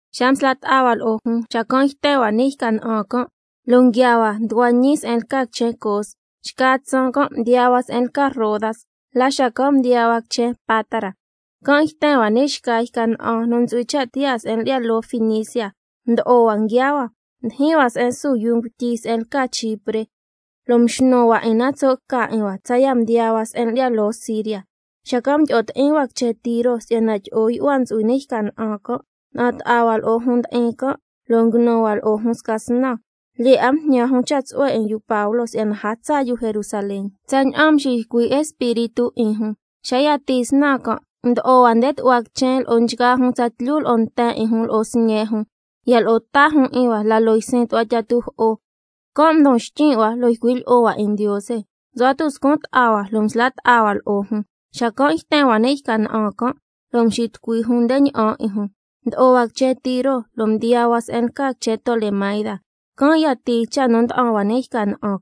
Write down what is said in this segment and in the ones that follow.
Xa msla' ta'a hua lo'o jun, xacan' yten hua ni' yca na'an can', lo' nguiaa hua nducua ñi se'en lca quichen Cos, xca tsaan can' mdiyaa hua se'en lca Rodas, la xacan' mdiyaa hua quichen Pátara. Can' yten hua ni' xca yca na'an nu ntsu'hui cha' tiyaa se'en lyi'ya loo Finicia, mdo'o hua nguiaa hua. Mdijin hua se'en su yuu ngutyi se'en lca Chipre, lo' mxnu hua 'in na tso' ca 'in hua, tsaya' mdiyaa hua se'en lyi'ya loo Siria, xacan' mdyi'o ti'in hua quichen Tiro si'yana tyi'o yu'hua ntsu'hui ni' yca na'an can'. Na'an ta'a hua lo'o jun ndi'in can', lo' nguinu hua lo'o jun sca snan, lyee 'a mjñan jun cha' tsu'hue 'in yu Pablo si'yana a tsaa yu Jerusalén, tsaña'an mxiycui' Espíritu 'in jun. Xa yatii snan can', mdo'o hua nde tu'hua quichen lo'o nchgaa jun tsatlyu lo'o nten 'in jun lo'o sñe' jun, ya lo'o ta jun 'in hua la loo ysin tu'hua tyi'a tujo'o, can' mdon xtyin' hua lo' ycui' lyi'o hua 'in Ndiose. Msu'hua tuscun ta'a hua lo' msla' ta'a hua lo'o jun, xacan' yten hua ni' yca na'an can', lo' mxitucui jun nde ña'an 'in jun. Mdo'o hua quichen Tiro lo' mdiyaa hua se'en lca quichen Tolemaida, can' yatii cha' nu mda'an hua ni' yca na'an.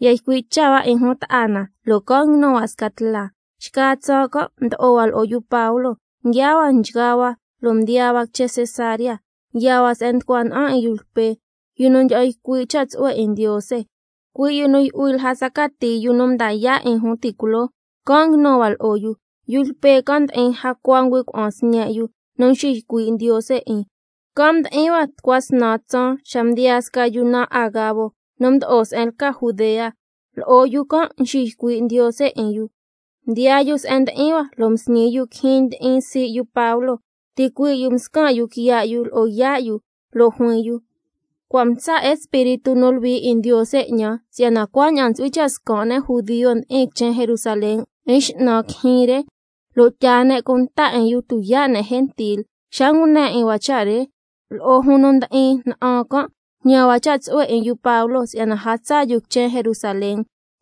Ya ycui' cha' hua 'in jun ta'a na, lo' can' nguinu hua sca tla. Xca tsaan can' mdo'o hua lo'o yu Pablo, nguiaa hua nchgaa hua, lo' mdiyaa hua quichen Cesarea. Yaa hua se'en nducua na'an 'in yu Lpe, yu nu ndyi'an ycui' cha' tsu'hue 'in Ndiose, cui' yu nu yu'hui lja tsa cati yu nu mda yaa' 'in jun ti' culoo, can' nguinu hua lo'o yu. Yu Lpe can' ndi'in jacua ngüi' cuna'an sñe' yu nu nxiycui' Ndiose 'in. Can' mdi'in hua tucua snan tsaan xa mdiyaa sca yu naan Agabo nu mdo'o se'en lca Judea, lo'o yu can' nxiycui' Ndiose 'in yu. Mdiyaa yu se'en ndi'in hua, lo' msñi yu quijyin ndi'in sii' yu Pablo, ticuii' yu mscan' yu quiya' yu lo'o yaa' yu, lo' juin yu: Cua' mtsa' Espíritu nu Luhui 'in Ndiose 'ñan, si'yana cuaña'an ntsu'hui cha' scan' ne' judio ndi'in quichen Jerusalén 'in x'nan quijyin re, lo' tyaa ne' cunta 'in yu tuyaa' ne' gentil. Xa ngune 'in hua cha' re, lo'o jun nu ndi'in na'an can' mjñan hua cha' tsu'hue 'in yu Pablo si'yana a tsaa yu quichen Jerusalén.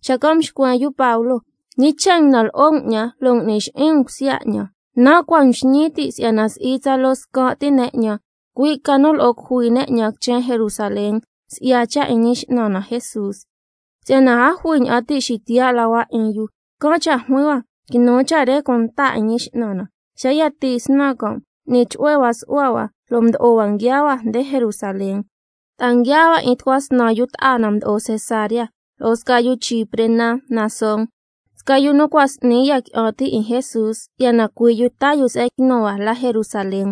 Xacan' mxcuen yu Pablo: ¿Ñi cha' nguinan lo'o um 'ñan, lo' ngui'ni xi'in um cusya 'ñan? Nan' cua' mxñin tin' si'yana si'i tsaloo scan' ti ne' 'ñan, cui' ca nu lo'o cujui ne' 'ñan quichen Jerusalén, si'ya cha' 'in Ñi X'nan na Jesús. Si'yana a jui ña'an ti' xitiyaa' la hua 'in yu, can' cha' juin hua: Quinu cha' re cunta 'in Ñi X'nan na. Xa yatii snan can', m'ni chu'hue hua su'hua hua, mdo'o hua nguiaa hua nde Jerusalén, lo' ta'a nguiaa hua 'in tucua snan yu ta'a na mdo'o Cesarea, lo'o sca yu Chipre naan Mnasón, sca yu nu cua' s'ni ya qui'an ti' 'in Jesús, si'yana cui' yu taa yu se'en quinu hua la Jerusalén.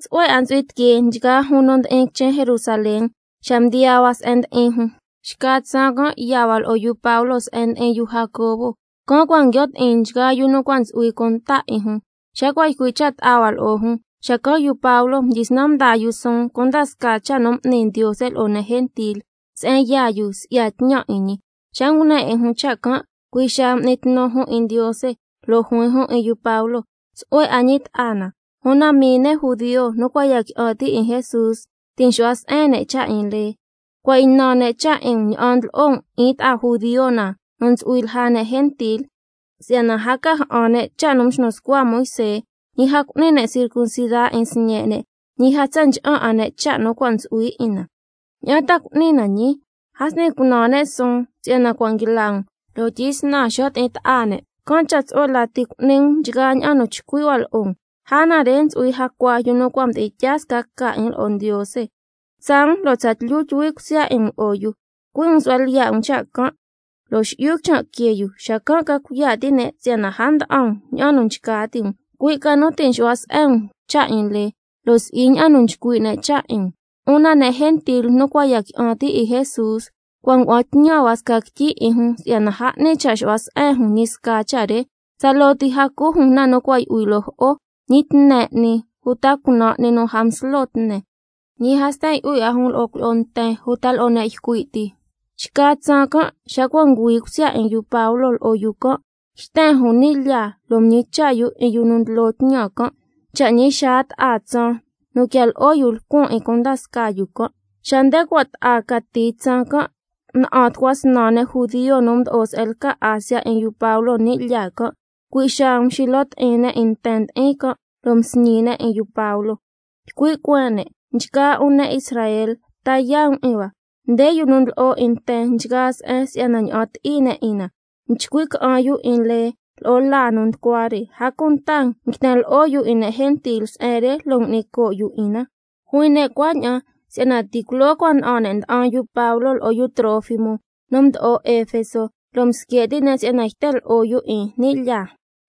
Tsu'hue 'a ntsu'hui tiquee nchgaa jun nu ndi'in quichen Jerusalén xa mdiyaa hua se'en ndi'in jun. Xca tsaan can' yaa hua lo'o yu Pablo se'en ndi'in yu Jacobo, can' cua' nguio' ti'in nchgaa yu nu cua' ntsu'hui cunta 'in jun. Xa cua' ycui' cha' ta'a hua lo'o jun, xacan' yu Pablo mdyisnan mdaa yu suun cunda scaa cha' nu m'ni Ndiose lo'o ne' gentil se'en yaa yu si'ya tñan 'in ñi. Xa ngune 'in jun cha' can' cui' xaa m'ni tnu jun 'in Ndiose, lo' juin jun 'in yu Pablo: Tsu'hue 'a ñi ta'a na, una mii ne' judio nu cua' ya qui'an ti' 'in Jesús ti' nxu'hua se'en ne' cha' 'in lee. Cua' ynan ne' cha' 'in um ña'an ndlo'o um 'in ta'a judio na nu ntsu'hui lja ne' gentil, si'yana a ca ja'an ne' cha' nu mxnu scua Moisé, ñi a cu'ni ne' circuncida 'in sñe' ne', ñi a tsa ncha'an 'a ne' cha' nu cua' ntsu'hui 'in na. ¿Ña'an ta cu'ni na ñii? A s'ni cunan ne' suun si'yana cua' nguila um, lo' tyisnan xo' ti'in ta'a ne'. Can' cha' tsu'hue lati cu'ni um nchgaa ña'an nu chcui' hua lo'o um. Lja na re ntsu'hui jacua yu nu cua' mdi'in tyaa sca ca 'in lo'o Ndiose. Tsaa um lo' tsatlyu tyuhui cusya 'in um lo'o yu, cui' um su'hua lyiya' um cha' can' lo' xi'yu quichan' quee yu, xacan' ca cuiya' ti' ne' si'yana a nda'an um ña'an nu nchca ti' um, cui' ca nu ti' nxu'hua se'en um cha' 'in lee, lo' si'i ña'an nu nchcui' ne' cha' 'in um. Una ne' gentil nu cua' ya qui'an ti' 'in Jesús, cua' ngua'an tñan hua sca quityi 'in jun si'yana a 'ni cha' xu'hua se'en jun ñi sca cha' re, tsaloo ti a cu jun na nu cua' yu'hui loo jo'o, ñi tne 'ni uta cunan' 'ni nu a nslo tne, ñi a sten yu'hui 'a jun lo'o cuilyi'o nten uta lo'o ne' ycui' ti. Xca tsaan can' xa cua' ngüi cusya 'in yu Pablo lo'o yu can', yten jun ni' lyaa lo' mñicha' yu 'in yu nu ndlo tñan can', cha' ñi xaa ta'a tsaan nu quian lo'o yu lcuan 'in cunda scaa yu can'. Xa nde cua' ta'a cati tsaan can', na'an tucua snan ne' judio nu mdo'o se'en lca Asia 'in yu Pablo ni' lyaa can', cui' xaa mxilo ti'in ne' 'in nten ndi'in can', lo' msñi ne' 'in yu Pablo. Ycui' cueen ne': Nchgaa 'un ne' Israel, ta yaa' um 'in hua. Nde yu nu ndlo'o 'in nten nchgaa se'en si'yana ña'an ti'i ne' 'in na, nchcui' ca'an ne' 'in lee lo'o laa nu nducua re, a cunta nguiten lo'o yu 'in ne' gentil se'en re, lo' ngui'ni coo' yu 'in na. Juin ne' cuaña'an si'yana ti' culoo cua' na'an ne' nda'an yu Pablo lo'o yu Trófimo nu mdo'o Efeso, lo' msque' ti' ne' si'yana cua' yten lo'o yu 'in ni' lyaa.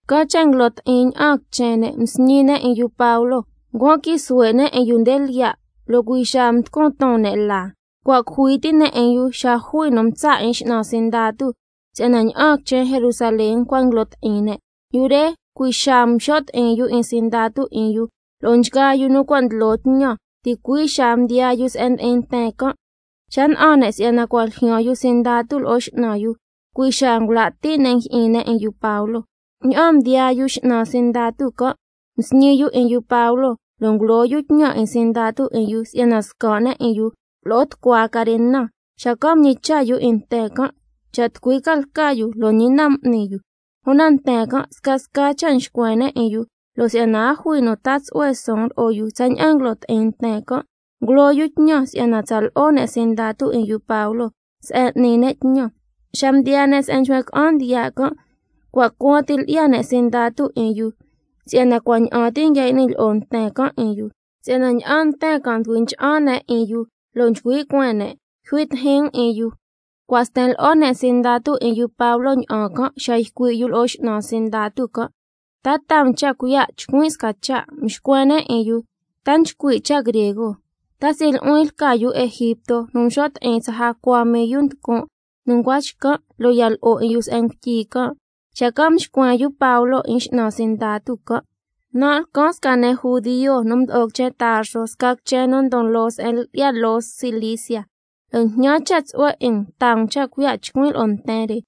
Can' cha' nguilo ti'in ña'aan quichen ne', msñi ne' 'in yu Pablo, ncuan quii suhue' ne' 'in yu nde lyiya', lo' cui' xaa mducun ton ne' laa. Cua' cujui ti ne' 'in yu xa jui nu mtsa' 'in x'nan sindatu, si'yana ña'aan quichen Jerusalén cua' nguilo ti'in ne'. Yu re cui' xaa mxo' ti'in yu 'in sindatu 'in yu lo'o nchgaa yu nu cua' ndlo tñan, ticui' xaa mdiyaa yu se'en ndi'in nten can'. Xa na'an ne' si'yana cua' ljyaan yu sindatu lo'o x'nan yu, cui' xaa ngula' ti' ne' njyi'in ne' 'in yu Pablo. Ña'aan mdiyaa yu x'nan sindatu can', msñi yu 'in yu Pablo, lo' ngulo yu tñan 'in sindatu 'in yu si'yana scan' ne' 'in yu lo'o tucua carena, xacan' mñicha' yu 'in nten can' cha' tucui ca lca yu, lo' ñi na m'ni yu. Una nten can' scasca cha' mxcuen ne' 'in yu, lo' si'yana a jui nu taa tsu'hue suun lo'o yu tsaña'an nguilo ti'in nten can', ngulo yu tñan si'yana tsa lo'o ne' sindatu 'in yu Pablo se'en n'ni ne' tñan. Xa mdiyaa ne' se'en nchcuen ca'an ndiya' can', cua' cuaan ti lyi'ya ne' sindatu 'in yu si'yana cua' ña'an ti nguia y'ni lyi'o nten can' 'in yu, si'yana ña'aan nten can' nducui ncha'an ne' 'in yu, lo' nchcui' cueen ne': Yjui tijin um 'in yu. Cua' sten lo'o ne' sindatu 'in yu Pablo ña'an can', xa ycui' yu lo'o x'nan sindatu can': ¿Ta taa um cha' cuiya' chcuin' sca cha'? Xacan' mxcuen ne' 'in yu: ¿Ta nchcui' cha' griego? ¿Ta si'i nu'huin lca yu Egipto nu mxo' ti'in tsa jacua mii yu nducun' nu ncua xcan', lo' ya lo'o 'in yu se'en ngutyi can'? Xacan' mxcuen yu Pablo 'in x'nan sindatu can': Nan' lcan sca ne' judio nu mdo'o quichen Tarso, sca quichen nu ndon loo se'en lyi'ya loo Cilicia, lo' jñan cha' tsu'hue 'in um taa um cha' cuiya' chcuin' lo'o nten re.